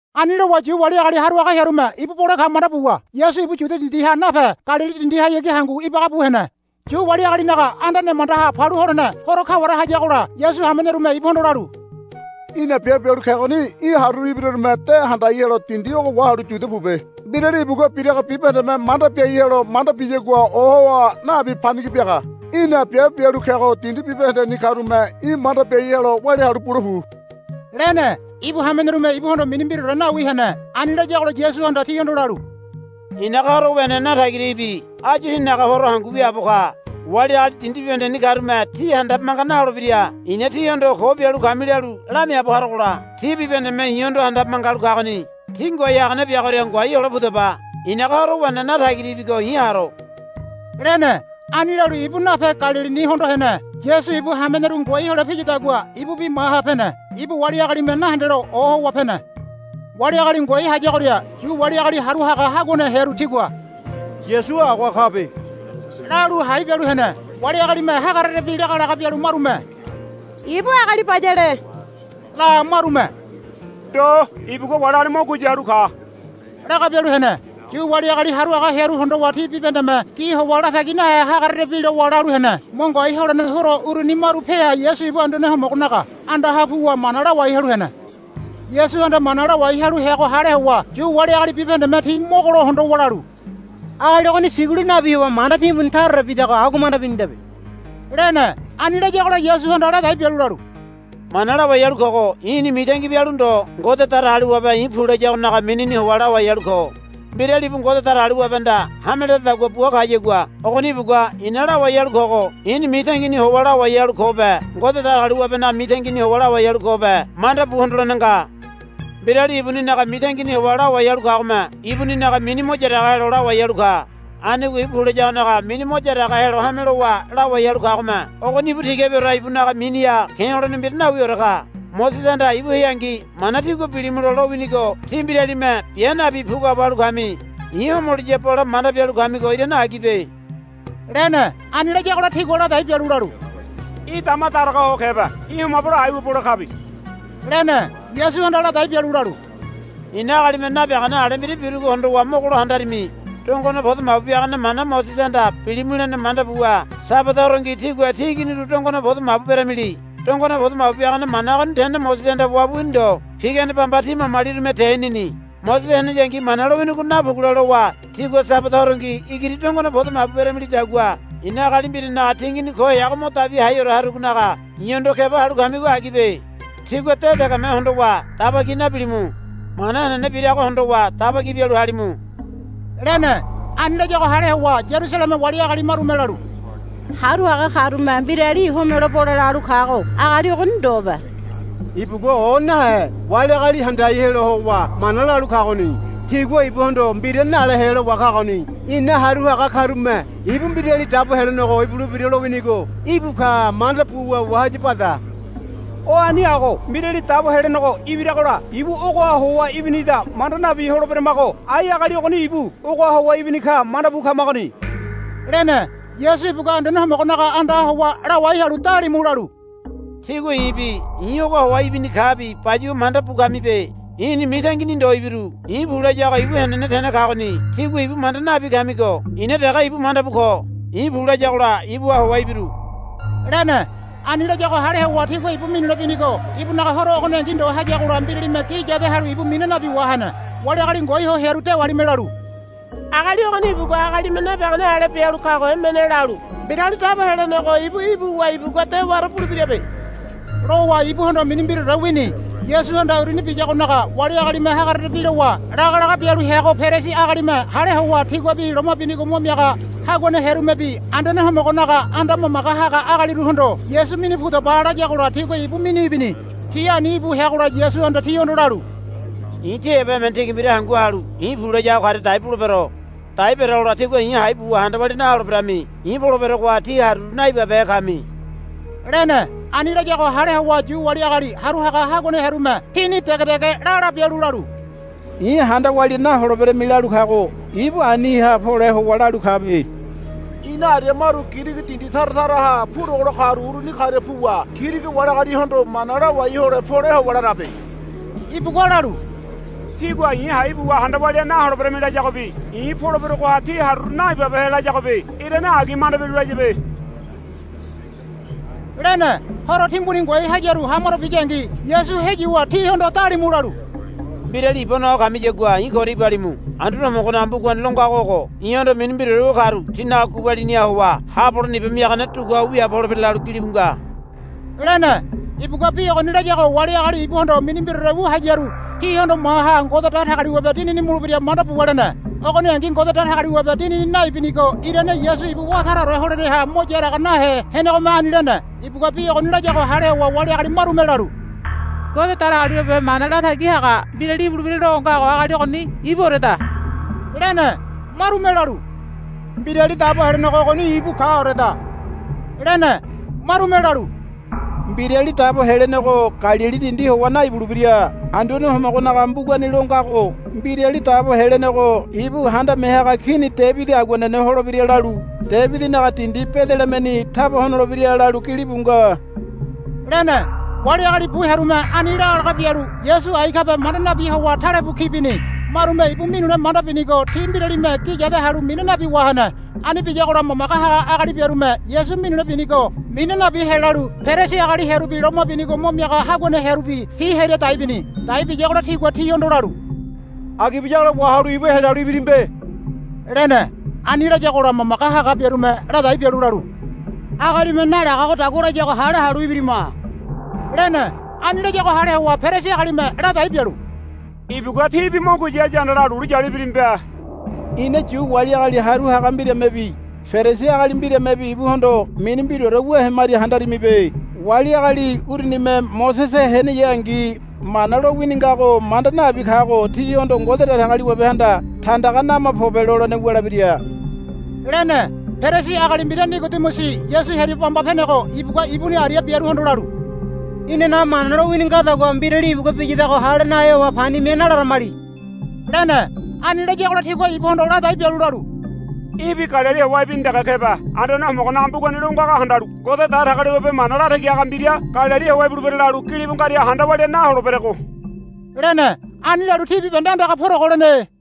Ani lowa Yu wali agali haru haga hearume ibu bole ka manda buwa Yasu ibu Yudia dindiha nape Galili dindihayagi hangu ibaga bu hene. Yu wali agalinaga Anda Nemandaha Palu Holene Horo kaware hayagola Yasu hamenerume ibuhondo lalu, Í̠na biabe bialu kegoni í̠ haruru ibirarume de handai helo dindi ogo wahalu Yudia pobe. Mbirali ibugua birago bibahendeme manda biai helo manda biyagua ohowa nabi panigi biaga. Í̠na biabe bialu kego dindi bibahendeni karume í̠ manda biai helo walia halu bule pu, lene. Ibu hamenerume ibuhondo mini mbiraore nawi hene. Ani layagola Yasuhanda tihondo lalu, I̱naga horo wene natagira ibi. Áyu tínaga horo hangu wiaabo ka. Wali agali dindi bibahendeni karume tí handabe manga naholebira. I̱na tíhondo ko bialu kami lalu lamiaabo harogola ti bibahendeme i̱hondo handabe manga halu kagoni. Tí ngoai hagane biagoria ngoai hole pudaba. I̱naga horo wene natagira ibigo i̱ haro, lene. Ani lalu ibu nape Galilini hondo hene. Yasu ibu hameneru ngoai hole piyadagua ibubi maha pene. Ibu wali agalime nahendelo ohowa pene. Wali agali ngoai hayagoria Yu wali agali haru haga haguane hearu tigua, Yasu agoha kabe, lalu hai bialu hene. Wali agalime hagarerebi laga laga bialu marume, Ibu agali bayale, la marume, Ndo ibugua wali agali mo guya halu ka, laga bialu hene. Yu wali agali haru haga hearu hondowa ti bibahendeme gi howa latagi nahe hagarerebi lowa lalu hene. Mo ngoai holene horo uruni maru peha Yasu ibu Anduane Homogonaga andaha puwa mana lawai halu hene. Yasuhanda mana lawai halu heago hale howa Yu wali agali bibahendeme ti mogolo hondowa lalu, Agali ogoni sigulu nabi howa manda timbuni taraore bidago agua manda binidabe, lene. Ani layagola Yasuhanda ladai bialu lalu, Mana lawai halu kogo i̱ni mitangi bialu ndo Ngode Datagaliwabe i̱ pu layagonaga minini howa lawai halu ko. Mbirali ibu Ngode Datagaliwabehanda hame ledadagua bua kayagua ogoni ibugua i̱na lawai halu kogo i̱ni mitangini howa lawai halu kobe Ngode Datagaliwabenaga mitangini howa lawai halu kobe manda bu hondolene nga. Mbirali ibuninaga mitangini howa lawai halu kagome ibuninaga mini mo yaraga helo lawai halu ka. Anigo ibu pu layagonaga mini mo yaraga helo hame lowa lawai halu kagome ogoni ibu tigabiore ibunaga miniha ke̱ holene mbira nawiore ka. Mosesehanda ibu heangi Mana tígua bilimulo lowinigo tí mbiralime bia nabi puguabo halu kami. I̱ homoliya bole manda bialu kamigo irane agibe, lene. Ani layagola tigua ladai bialu lalu, Í̠ dama daraga ho kebe. Í̠ homabelo aiwa bole kabe, lene. Yasuhanda ladai bialu lalu, I̱na agalime nabiagane ale mbira birugo hondowa mogolo handarimi. Dongone podo mabu biagane mana Mosesehanda bilimu lene manda buwa Sabada horongi tígua tí iginiru dongone podo mabu beramili. Dongone podo mabu biagane mana ogoni tene Mosesehanda wabu wini ndo. Pigane bamba tí mamalirume tenini. Mosese heneyangi Mana lowinigo napugule lowa tígua Sabada horongi igiri dongone podo mabu beramilidagua i̱na agali mbiranaga tingini ko heago mo dabi haiore harugonaga i̱hondo keba halu kamigo agibe. Tígua de degeme hondowa daba ki nabilimu. Mana henene birago hondowa daba ki bialu halimu, lene. Ani layago hale howa Yarusaleme wali agali marume lalu, Haru haga karume mbirali homelo bole lalu kago agali ogoni ndobe. Ibugua o nahe wali agali handai helo howa mana lalu kagoni. Tigua ibuhondo mbira nale helo wa kagoni. Ina haru haga karume ibu Mbirali Dabo Helenego ibulebira lowinigo ibu ka manda buwa wahaya bada. O ani ago Mbirali Dabo Helenego ibiragola ibu ogoha howa ibinida manda nabi holeberamago ai agali ogoni ibu ogoha howa ibini ka manda bu kamagoni, lene. Yasu ibugua Anduane Homogonaga andaha howa lawai halu dalimu lalu, Tígua i̱bi i̱ ogoha howa ibini kabi bayuwa manda bu kamibe. I̱ni mitangini ndo ibiru. I̱ pu layago ibu henene tene kagoni. Tígua ibu manda nabi kamigo i̱na dege ibu manda bu ko. I̱ pu layagola ibuha howa ibiru, lene. Ani layago hale howa tigua ibu minule binigo ibunaga horo ogoningi ndo hayagola mbiralime gi yade halu ibu mina nabi wahene. Wali agali ngoai ho hearu dewalime lalu, Agali ogoni ibugua agalime nabiagane ale bialu kago emene lalu Mbirali Dabo Helenego ibu ibuwa ibugua dewaore bulebirabe, lowa ibuhondo mini mbiraore wini. Yasuhanda uruni biyagonaga wali agalime hagarerebi lowa laga laga bialu heago Perisi agalime hale howa tiguabi loma binigo mo miaga haguane hearumebi Anduane Homogonaga anda mamage haga agaliruhondo, Yasu minu pudaba, layagola tigua ibu minu ibini. Ti ani íbu heagola Yasuhanda tihondo lalu, I̱ tí heba emene tigi mbira hangu halu i̱ pu layago karia dai bulebero. Dai berogola tígua i̱ hai buwa handa walia naholeberami. I̱ poleberogoha tí haruru naibabehe kami, lene. Ani layago hale howa Yu wali agali haru haga haguane hearume tini dege dege la la bialu lalu, I̱ handa walia naholeberami lalu kago ibu aniha pole howa lalu kabe. Ina aria maru Girigi dindi tara taraha purogolo karu uruni karia puwa Girigi wali agalihondo mana lawai hole pole howa larabe. Ibugua lalu, Tígua i̱ hai buwa handa walia naholeberemi, layagobi, I̱ poleberogoha tí haruru naibabehe, layagobi irane agi manda bialu layabe, lene. Horo timbuni ngoai hayaru hamaro biyangi Yasu heyuwa tihondo dalimu lalu, Mbirali iba noa kamiyagua i̱ koria ibalimu. Anduane Homogonaga mbugani lo ngago ogo, I̱hondo mini mbiraore wu karu tinaga gubaliniha howa haabo holene iba miagane duguabo holebira, lalu gilibu nga, lene. Ibugua bi ogoni layago wali agali ibuhondo mini mbiraore wu hararu tihondo maha Ngode Datagaliwabe Dinini mulebira manda buwa lene. Ogoningi Ngode Datagaliwabe Dinini naibinigo irane Yasu ibu wá taraore holeneha mo yaraga nahe henegome ani lene. Ibugua bi ogoni layago hale howa wali agali marume lalu, Ngode Datagaliwabe Mana Latagi Haga Mbirali ibulebira lo ngago agali ogoni ibuoreda, lene. Marume lalu, Mbirali Dabo Helenego ogoni íbu kaoreda, lene. Marume lalu, Mbirali Dabo Helenego Galili dindi howa naibulebira. Anduane Homogonaga mbugani lo ngago, Mbirali Dabo Helenego ibu handame haga kini Debidi aguanene holebira, lalu, Debidinaga dindi Bedelehemeni taba honolebira, lalu gilibu nga, lene. Wali agali bu hearume ani laga laga bialu Yasu ai kabe manda nabi howa talebu ki bini. Marume ibu minule manda binigo ti mbiralime gi yade halu mina nabi wahene. Ani biyagola mamage haga agali biarume Yasu minule ibinigo mina nabi helalu Perisi agali hearubi loma binigo mo miaga haguane hearubi ti hearia dai bini. Dai biyagola tigua tihondo lalu, Agi biyagola wahalu ibu helalu ibirimibe, lene. Ani layagola mamage haga biarume ladai bialu lalu, Agalime nalagagodagua layago hale halu ibirima, lene. Ani layago hale howa Perisi agalime ladai bialu, Ibugua tíbi mo guya haya handala lulu yalu ibirimibe. Ina Yu wali agali haru haga mbiramebi Perisi agali mbiramebi ibuhondo mini mbiraore wu hemaria handarimibe. Wali agali urunime Mosese heneyangi Mana lowini ngago manda nabi kago tihondo Ngode Datagaliwabehanda, Tandaga nama pobe, lolene wulebira, lene. Perisi agali mbira Nigodimusi Yasu hearia bamba penego ibugua ibuni aria biaruhondo lalu, Inanaga Mana lowini ngadagua mbirali ibugua biyadago hale nahe howa pani mia nalaramali, lene. Ani layagola tigua ibuhondo ladai bialu lalu, Í̠bi Galili howa ibini dege kebe. Anduane Homogonaga mbugani lo ngago handalu Ngode Datagaliwabe mana latagi haga mbira Galili howa ibulebira lalu gilibu ngaria handa walia naholeberego, lene. [ Ani lalu ti bibahende andaga purogo lene.